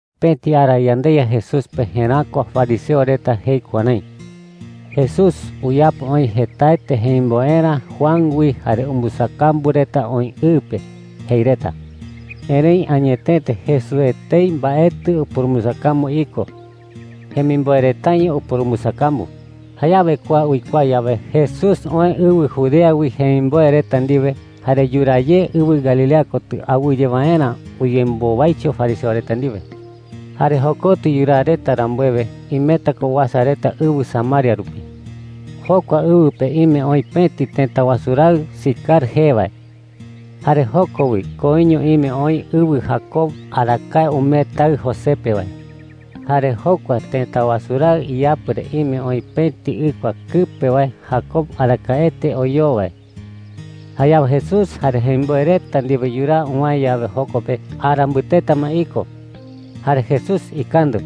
Pëti ara yandeYa Jesús pe jeräkua fariseo reta jei kuärái: “Jesús uyapo oï jetaete jemimboerä Juan wi jare umbɨsakambu reta oï ɨ pe,” jei reta. (Erëi añetete Jesús etei mbaetɨ upurumbɨsakambu iko. Jemimboe retaño upurumbɨsakambu.) Jayawe kua uikuaa yawe, Jesús oë ɨwɨ Judea wi jemimboe reta ndiwe, jare yuraa ye ɨwɨ Galilea kotɨ awɨye waerä uyembowaicho fariseo reta ndiwe. Jare jokotɨ yuraa reta rambuewe, imeta ko uasa reta ɨwɨ Samaria rupi. Jokua ɨwɨ pe ime oï pëti tëta wasu raɨ Sicar jee wae. Jare joko wi koiño ime oï ɨwɨ Jacob arakae umee taɨ José pe wae. Jare jokua tëta wasu raɨ iyapɨ re ime oï pëti ɨkua kɨpe wae Jacob arakaete oyoo wae. Jayawe Jesús jare jemimboe reta ndiwe yuraa uwäe yawe joko pe, ara mbɨteta ma iko. Jare Jesús ikandɨ,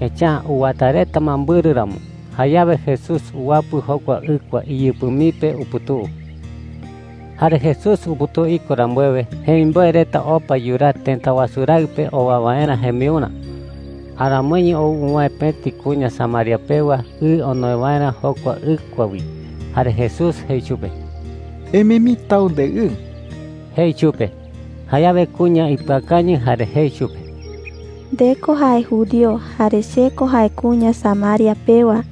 echa’ä uwata reta ma mbɨrɨ ramo. Jayawe Jesús uwapɨ jokua ɨkua iyɨpɨ mii pe uputuu. Jare Jesús uputuu iko rambuewe, jemimboe reta opa yuraa tëta wasu raɨ pe owa waerä jembiurä. Aramoiño ou uwäe pëti kuña Samaria pewa ɨ onoe waerä jokua ɨkua wi. Jare Jesús jei chupe: “Emee mii tau ndeɨɨ,” jei chupe. Jayawe kuña ipɨakañɨ jare jei chupe: “Nde ko jae judío, jare che ko jae kuña Samaria pewa.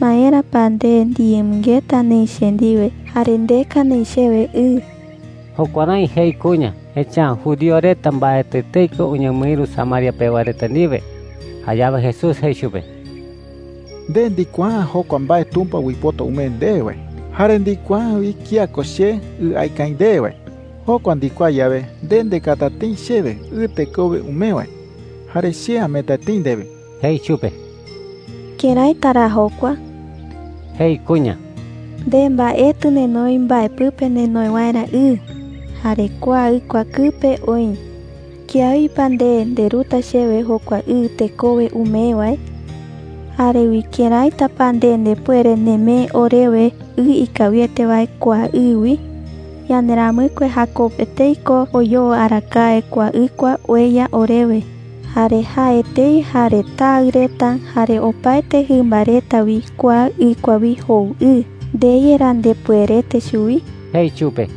¿Maera pa nde ndiyemɨngeta neï che ndiwe jare ndeka neï chewe ɨ?” jei chupe. Jukuärái jei kuña, echa’ä judío reta mbaetɨ etei ko uñemɨïru Samaria pewa reta ndiwe. Jayawe Jesús jei chupe: “Nde ndikuaa’ä jokua mbae Tumpa uipota umee ndewe wae. Jare ndikuaa’ä wi kía ko che ɨ aeka aï ndewe wae. Jokua ndikuaa yawe, nde ndekata tëi chewe ɨ tekowe umee wae, jare che ameeta tëi ndewe,” jei chupe. “¿Këraita ra jokua?” jei kuña. “Nde mbaetɨ nenoi mbae pɨpe nenoe waerä ɨ, jare kua ɨkua kɨpe oï. ¿Kiawi pa nde nderuta chewe jokua ɨ tekowe umee wae? Jare wi, ¿këraita pa nde ndepuere nemee orewe ɨ ikawiete wae kua ɨ wi? Yanderamɨkue Jacob etei ko oyoo arakae kua ɨkua ueya orewe. Jare jae etei, jare taɨ reta, jare opaete jɨmba reta wi kua ɨkua wi jou ɨ. ¿Nde yerá ndepuerete chuwi?” jei chupe.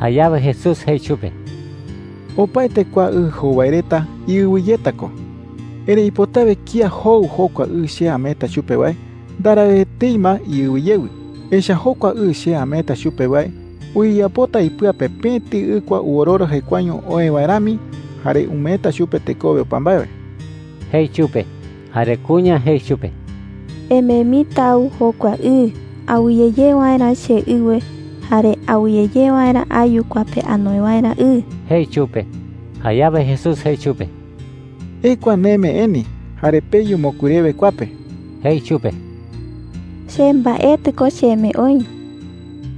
Jayawe Jesús jei chupe: “Opaete kua ɨ jou wae reta iɨwe yeta ko,” jei. “Erëi ipotawe kía jou jokua ɨ che ameeta chupe wae, ndarau etei ma iɨwe yewɨ. Echa’ä jokua ɨ che ameeta chupe wae uyeyapota ipɨa pe pëti ɨkua ɨwororo jekuaeño oë wae rami, jare umeeta chupe tekowe opa mbae wae,” jei chupe. Jare kuña jei chupe: “Emee mii tau jokua ɨ, awɨye ye waerä cheɨwe jare awɨye ye waerä ayu kua pe anoe waerä ɨ,” jei chupe. Jayawe Jesús jei chupe: “Ekua neme eni, jare peyu mokui rewe kua pe,” jei chupe. “Che mbaetɨ ko cheme oï,”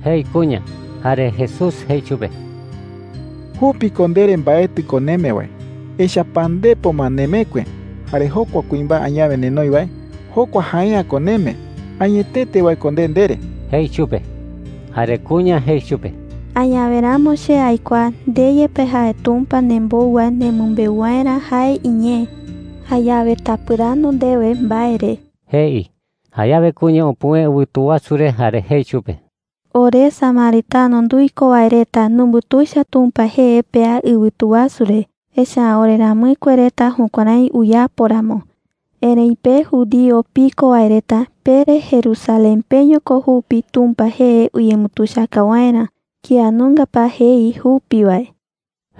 jei kuña. Jare Jesús jei chupe: “Jupi ko ndere mbaetɨ ko neme wae. Echa’ä pandepo ma nemekue, jare jokua kuimbae añawe nenoi wae, jokua jae’ä ko neme. Añetete wae ko nde ndere,” jei chupe. Jare kuña jei chupe: “Añawe ramo che aikuaa nde yepe jae Tumpa nembou wae nemɨmbeu waerä jae iñee. Jayawe tapɨrandu ndewe mbae re,” jei. Jayawe kuña upuwëe ɨwɨtu wasu re jare jei chupe: “Ore samaritano nduiko wae reta numbutuicha Tumpa jee pea ɨwɨtu wasu re, echa’ä oreramɨkue reta jukuärái uyapo ramo. Erëi pe judío piko wae reta pere Jerusalén peño ko jupi Tumpa jee uyembutuichaka waerä. ¿Kía nunga pa jei jupi wae?”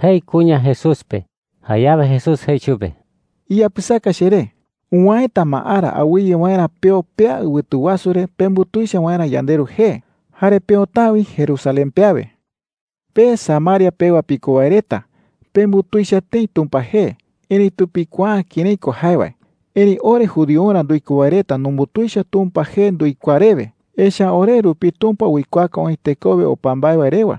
jei kuña Jesús pe. Jayawe Jesús jei chupe: “Iyapɨsaka cheré. Uwäeta ma ara awɨye waerä peo pea ɨwɨtu wasu re pembutuicha waerä yandeRu jee. Jare peota’ä wi Jerusalén pe awe,” jei. “Pe Samaria pewa piko wae reta pembutuicha tëi Tumpa jee, erëitu pikuaa’ä kërái ko jae wae. Erëi ore judiorä nduiko wae reta numbutuicha Tumpa jee nduikuaa rewe. Echa’ä ore rupi Tumpa uikuaaka oï tekowe opa mbae wae rewa,”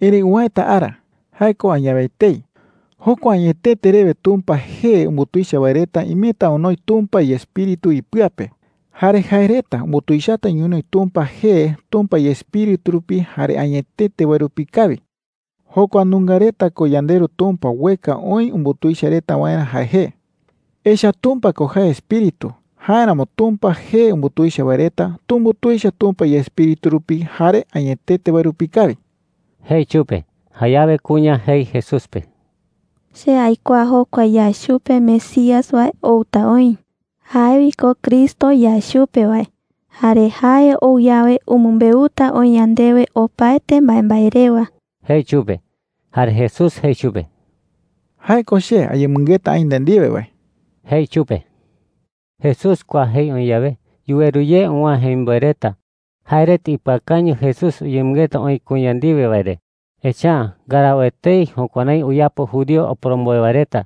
jei. “Erëi uwäeta ara – jae ko añawe etei – jokua añetete rewe Tumpa jee umbutuicha wae reta imeta onoi Tumpa iEspíritu ipɨa pe. Jare jae reta umbutuichata ñonoï Tumpa jee Tumpa iEspíritu rupi jare añetete wae rupi kawi. Jokua nunga reta ko yandeRu Tumpa ueka oï umbutuicha reta waerä jae jee. Echa’ä Tumpa ko jae Espíritu. Jáeramo Tumpa jee umbutuicha wae reta tumbutuicha Tumpa iEspíritu rupi jare añetete wae rupi kawi,” jei chupe. Jayawe kuña jei Jesús pe: “Che aikuaa jokua yae chupe Mesías wae outa oï – jae wi ko Cristo yae chupe wae. Jare jae ou yawe, umɨmbeuta oï yandewe opaete mbaembae rewa,” jei chupe. Jare Jesús jei chupe: “Jae ko che ayemɨngeta aï nde ndiwe wae,” jei chupe. Jesús kua jei oï yawe, yuweru ye uwäe jemimboe reta. Jae reta ipɨakañɨ Jesús uyemɨngeta oï kuña ndiwe wae re, echa’ä ndarau etei jukuärái uyapo judío oporomboe wae reta.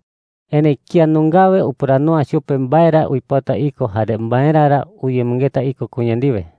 Erëi kía nungawe upɨrandu’ä chupe mbae ra uipota iko jare maera ra uyemɨngeta iko kuña ndiwe.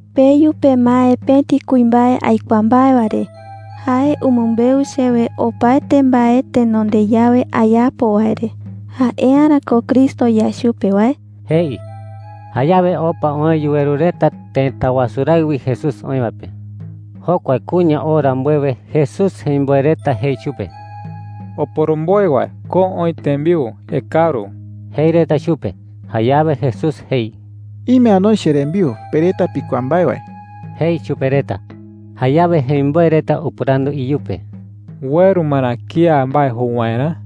“Peyu pemae pëti kuimbae aikuaa mbae wae re. Jae umɨmbeu chewe opaete mbae tenonde yawe ayapo wae re. ¿Jae’ä ra ko Cristo yae chupe wae?” jei. Jayawe opa oë yuweru reta tëta wasu raɨ wi Jesús oï wae pe. Jokua kuña oo rambuewe, Jesús jemimboe reta jei chupe: “Oporomboe wae, ko oï tembiu. Ekaru,” jei reta chupe. Jayawe Jesús jei: “Ime anoi cherembiu pe reta pikuaa mbae wae,” jei chupe reta. Jayawe jemimboe reta upɨrandu iyupe: “¿Ueru ma ra kía mbae jou waerä?”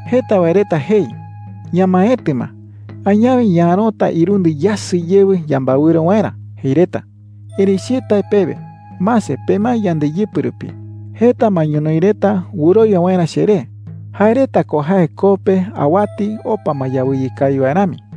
“Jeta wae reta jei: ‘Ñamaetɨ ma. Añawe ñaärota irundɨ yasɨ yewɨ yambaewɨro waerä,’ jei reta. Erëi che tae pewe: Mase, pemae yandeyɨpɨ rupi. Jeta ma ñonoï reta wɨrowia waerä cheré. Jae reta ko jae koo pe awati opa ma yawɨye kawi wae rami,” jei.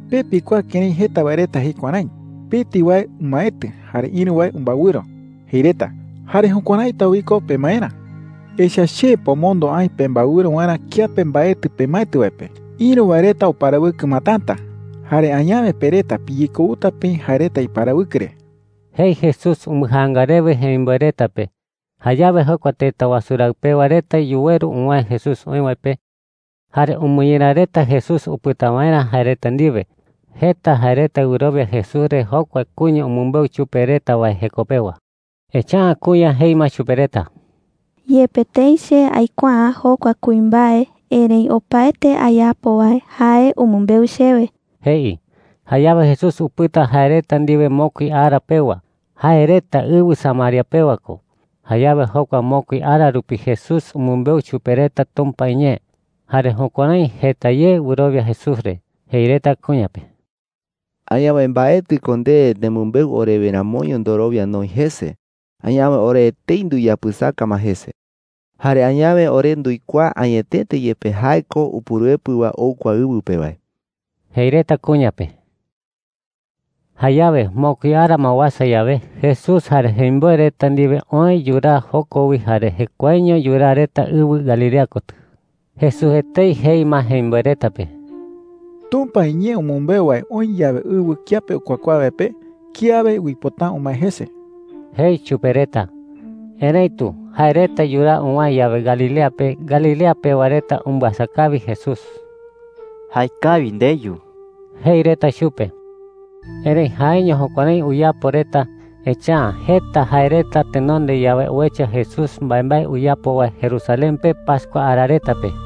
“Pe pikuaa kërái jeta wae reta jei kuärái: ‘Pëti wae umaetɨ jare ïru wae umbaewɨro,’ jei reta. Jare jukuäraita wi ko pemaerä. Echa’ä che pomondo aï pembaewɨro waerä kiape mbaetɨ pemaetɨ wae pe. Ïru wae reta uparawɨkɨ ma täta, jare añawe pe reta piyekouta peï jae reta iparawɨkɨ re,” jei Jesús umbɨjaanga rewe jemimboe reta pe. Jayawe jokua tëta wasu raɨ pewa reta yuweru uwäe Jesús oï wae pe, jare umɨñera reta Jesús upɨta waerä jae reta ndiwe. Jeta jae reta wɨrowia Jesús re jokua kuña umɨmbeu chupe reta wae jeko pewa. Echa’ä kuña jei ma chupe reta: “Yepe tëi che aikuaa’ä jokua kuimbae, erëi opaete ayapo wae jae umɨmbeu chewe,” jei. Jayawe Jesús upɨta jae reta ndiwe mokui ara pewa. Jae reta ɨwɨ Samaria pewa ko. Jayawe jokua mokui ara rupi Jesús umɨmbeu chupe reta Tumpa iñee. Jare jukuärái jeta ye wɨrowia Jesús re. Jei reta kuña pe: “Añawe mbaetɨ ko nde nemɨmbeu orewe ramoño ndorowia noï jese. Añawe ore etei nduyapɨsaka ma jese. Jare añawe ore nduikuaa añetete yepe jae ko Upuruepɨ wae ou kua ɨwɨ pe wae,” jei reta kuña pe. Jayawe mokui ara ma uasa yawe, Jesús jare jemimboe reta ndiwe oë yuraa joko wi jare jekuaeño yuraa reta ɨwɨ Galilea kotɨ. Jesús etei jei ma jemimboe reta pe: “Tumpa iñee umɨmbeu wae oï yawe ɨwɨ kiape ukuakuaa wae pe, kiawe uipota’ä umae jese,” jei chupe reta. Erëitu jae reta yuraa uwäe yawe Galilea pe, Galilea pewa reta umbɨasa kawi Jesús. “Jaekawi ndeyu,” jei reta chupe. Erëi jaeño jukuärái uyapo reta, echa’ä jeta jae reta tenonde yawe uecha Jesús mbaembae uyapo wae Jerusalén pe pascua ara reta pe.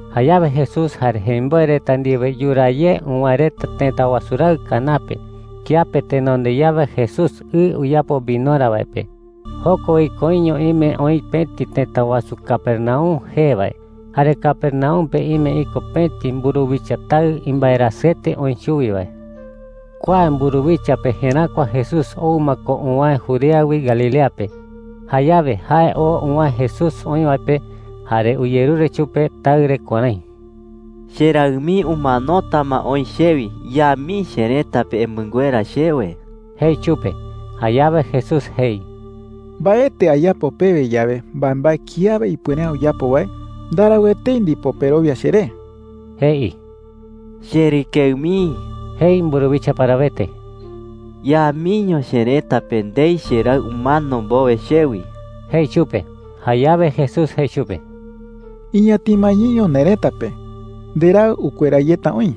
Jayawe Jesús jare jemimboe reta ndiwe yuraa ye uwäe reta tëta wasu raɨ Caná pe, kiape tenonde yawe Jesús ɨ uyapo vinorä wae pe. Joko wi koiño ime oï pëti tëta wasu Capernaum jee wae. Jare Capernaum pe ime iko pëti mburuwicha taɨ imbaerasɨete oï chuwi wae. Kua mburuwicha pe jeräkua Jesús ou ma ko uwäe Judea wi Galilea pe. Jayawe jae oo uwäe Jesús oï wae pe, jare uyerure chupe taɨ re kuärái: “Cheraɨ mii umanota ma oï chewi. Ya mii cherëta pe emɨnguera chewe,” jei chupe. Jayawe Jesús jei: “Mbaetɨ ayapo pewe yawe mbaembae kiawe ipuere’ä uyapo wae, ndarau etei ndipo perowia cheré,” jei. “Cherɨkeɨ mii,” jei mburuwicha parawete, “ya miño cherëta pe ndei cheraɨ umano mbowe chewi,” jei chupe. Jayawe Jesús jei chupe: “Iñatima yeño nerëta pe. Nderaɨ ukuera yeta oï,”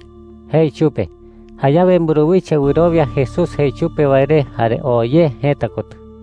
jei chupe. Jayawe mburuwicha wɨrowia Jesús jei chupe wae re jare oo ye jëta kotɨ.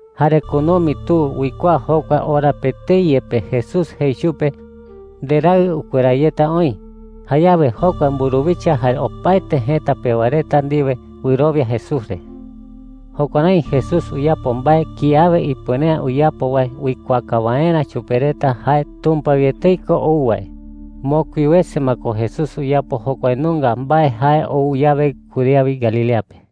Jare kunumi tu uikuaa jokua ora pe etei yepe Jesús jei chupe, “Nderaɨ ukuera yeta oï.” Jayawe jokua mburuwicha jare opaete jëta pewa reta ndiwe wɨrowia Jesús re. Jukuärái Jesús uyapo mbae kiawe ipuere’ä uyapo wae uikuaaka waerä chupe reta jae Tumpa wi etei ko ou wae. Mokui wese ma ko Jesús uyapo jokua nunga mbae jae ou yawe Judea wi Galilea pe.